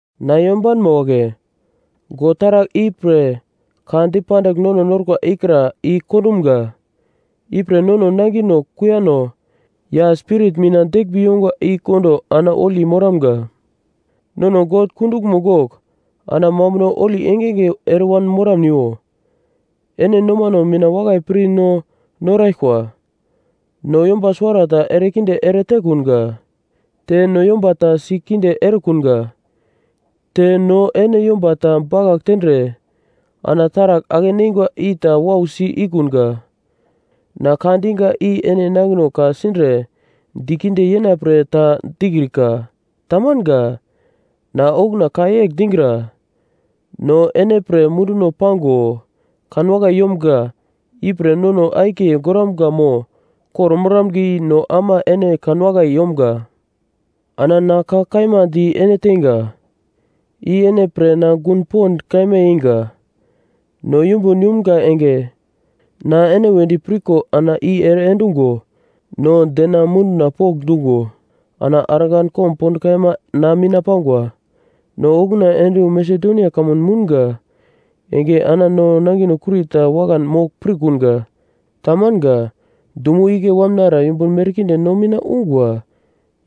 Na yombanma wagle, God taragl i pre ka dipandigl nono norkwa ikra i kondumga. Ipre nono nangino kuiyano ya spirit mina deglmbi yongwa i kondo ana holi moramga. Nono God kunduglmo gogl ana mambuno holi engenge ere moramniwo. Ene nomano mina wakai pir no noraglkwa. No yomba suwarata erekinde ere tekunga, te no yomba ta si kinde erekunga. Te no ene yomba ta bakagl tendre ana taragl ake-neingwa i ta wausi ikunga. Na ka diga i ene nangino ka-sindre dikinde yena pre ta dikrika. Tamanga. Na okuna ka yegl digra, no ene pre munduno pango kanwakai yomga, ipre nono akiye goramga mo kor-moramga i no ama ene kanwakai yomga. Ana na ka kaima di ene teinga, i ene pre na gun pond kaima yeinga. No yumbun yumga enge, na ene wedi pirko ana i ere endungo no dena munduno pokndungo ana argan komb pond kaima na mina pangwa. No okuna ende wu Masedonia kamun mounga enge ana no nangino kurita wakan mogl pirkunga. Tamanga. Dumo igle wamnara yumbun merkinde no mina ungwa,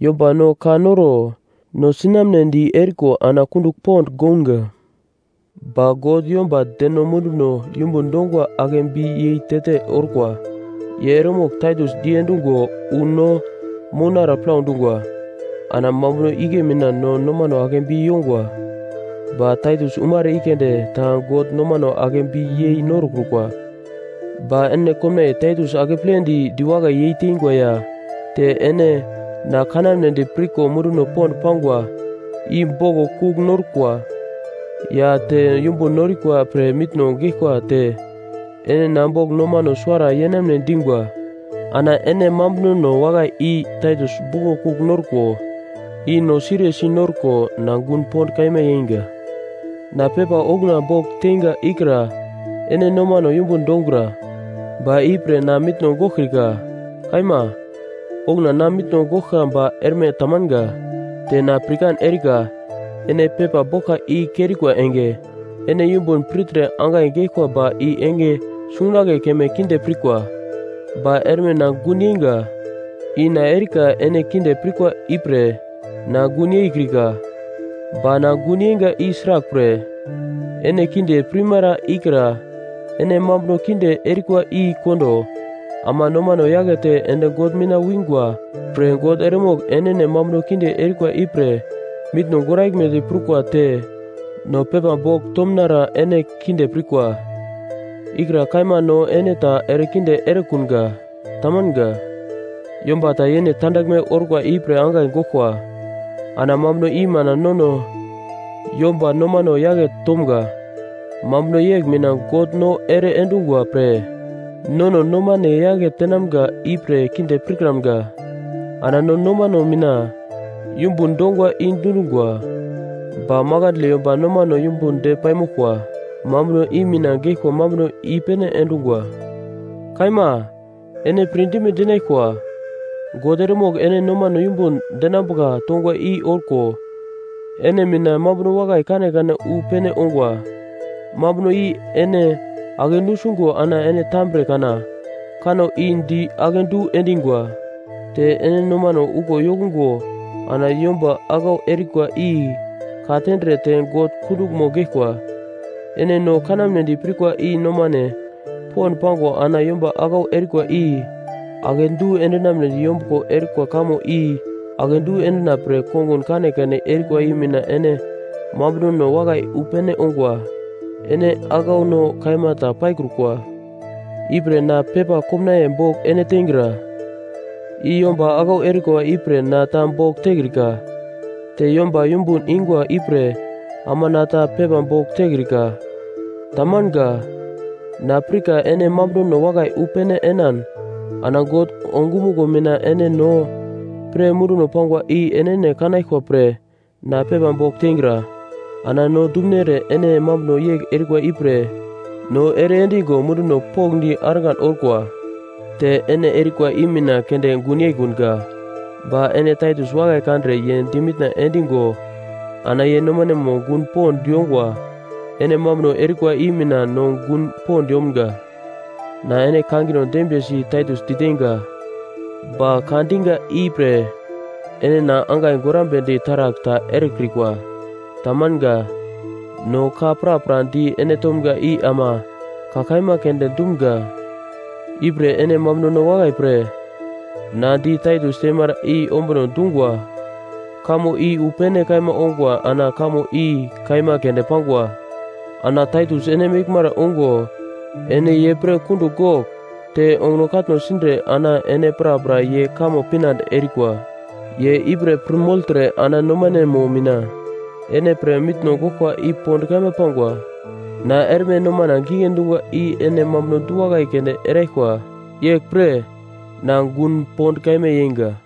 yomba no ka noro no sinamnedi eriko ana kundugl pond gounga. Ba God, yomba deno munduno yumbun dongwa akebi yei te-te orkwa. Ye eremogl Taitus diendungo wu no mounara plau dungwa, ana mambuno igle mina no nomano akebi yongwa. Ba Taitus umara i keunde ta God nomano akebi yei norokrukwa. Ba ene komnaiye Taitus akepledi diwakai yeitengwa ya te ene na kanamnedi pirko munduno pond pangwa, i boglo kugl norkwa, ya te yumbun norikwa pre mitno geglkwa te ene na bogl nomano suwara yenamne dingwa. Ana ene mambunono wakai i Taitus boglo kugl norkwa i no siriyesi norko na gun pond kaima yeinga. Na pepa okuna bogl teinga ikra ene nomano yumbun dongura, ba i pre na mitno goglkrika. Kaima, okuna na mitno goglka ba erme tamanga. Te na pirkan erika ene pepa boglka i kerikwa enge, ene yumbun pirtre angai geglkwa ba i enge sungunagle keme kinde pirkwa. Ba erme na gun yeinga, i na erika ene kinde pirkwa ipre na gun yeikrika, ba na gun yeinga i sraglpre, ene kinde pirmara ikra ene mambuno kinde erikwa i kondo ama nomano yakete ende God mina wingwa pre God eremogl enene mambuno kinde erikwa ipre mitno goraglmedi prukwa te no pepa bogl tomunara ene kinde pirkwa, ikra kaima no ene ta erekinde erekunga. Tamanga. Yomba ta yene tandaglme orkwa ipre angai goglkwa, ana mambuno i mina nono yomba nomano yake tomga. Mambuno yegl mina God no ere endungwa pre nono nomane yake tenamga ipre kinde pirkramga. Ana no nomano mina yumbun dongwa i dundungwa. Ba makandle yomba nomano yumbun de paimoglkwa. Mambuno i mina geglkwa mambuno i-pene endungwa. Kaima ene pirdime dinaglkwa. God eremogl ene nomano yumbun denambuka tongwa i orko ene mina mambuno wakai kanekane wu pene ongwa. Mambuno i ene ake nusungo ana ene tambre kana kanno di akedu endingwa. Te ene nomano uglo yokungo ana yomba aglau erikwa i ka-tendre te God kunduglmo geglkwa. Ene no kanamnedi pirkwa i nomane pond pango ana yomba aglau erikwa i akedu endinamnedi yombuglo erikwa kamo i akedu endina pre kongun kanekane erikwa i mina ene mambunono wakai wu pene ongwa. Ene aglauno kaima ta paikrukwa. Ipre na pepa komnaiye bogl ene teingra, i yomba aglau erikwa ipre na ta bogl tekrika, te yomba yumbun ingwa ipre ama na ta pepa bogl tekrika. Tamanga. Na pirka ene mambunono wakai wu pene enan ana God ongumuglo mina ene no pre munduno pangwa i enene kanaglkwa pre na pepa bogl teingra. Ana no dumunere ene mambuno yegl erikwa ipre no ere endingo munduno pokndi argan orkwa. Te ene erikwa i mina keunde gun yeikunga, ba ene Taitus wakai kandre ye di mitna endigo ana ye nomanemo gun pond yongwa ene mambuno erikwa i mina no gun pond yomga. Na ene kangino dembiyesi Taitus diteinga, ba ka diga ipre ene na angai gorambedi taragl ta erekrikwa. Tamanga. No ka prapra di ene tomga i ama ka kaima keunde dumga. Ipre ene mambunono wakai pre na di Taitus teimara i ombuno dungwa kamo i wu pene kaima ongwa ana kamo i kaima keunde pangwa. Ana Taitus ene meglmara ungo ene ye pre kundugl gogl te onguno katno sindre ana ene prapra ye kamo pinande erikwa. Ye ipre pir mogltre ana nomanemo mina ene pre mitno goglkwa i pond kaima pangwa. Na erme nomana gigle dungwa i ene mambuno du-wakai keunde eraglkwa. Yeglpre na gun pond kaima yeinga.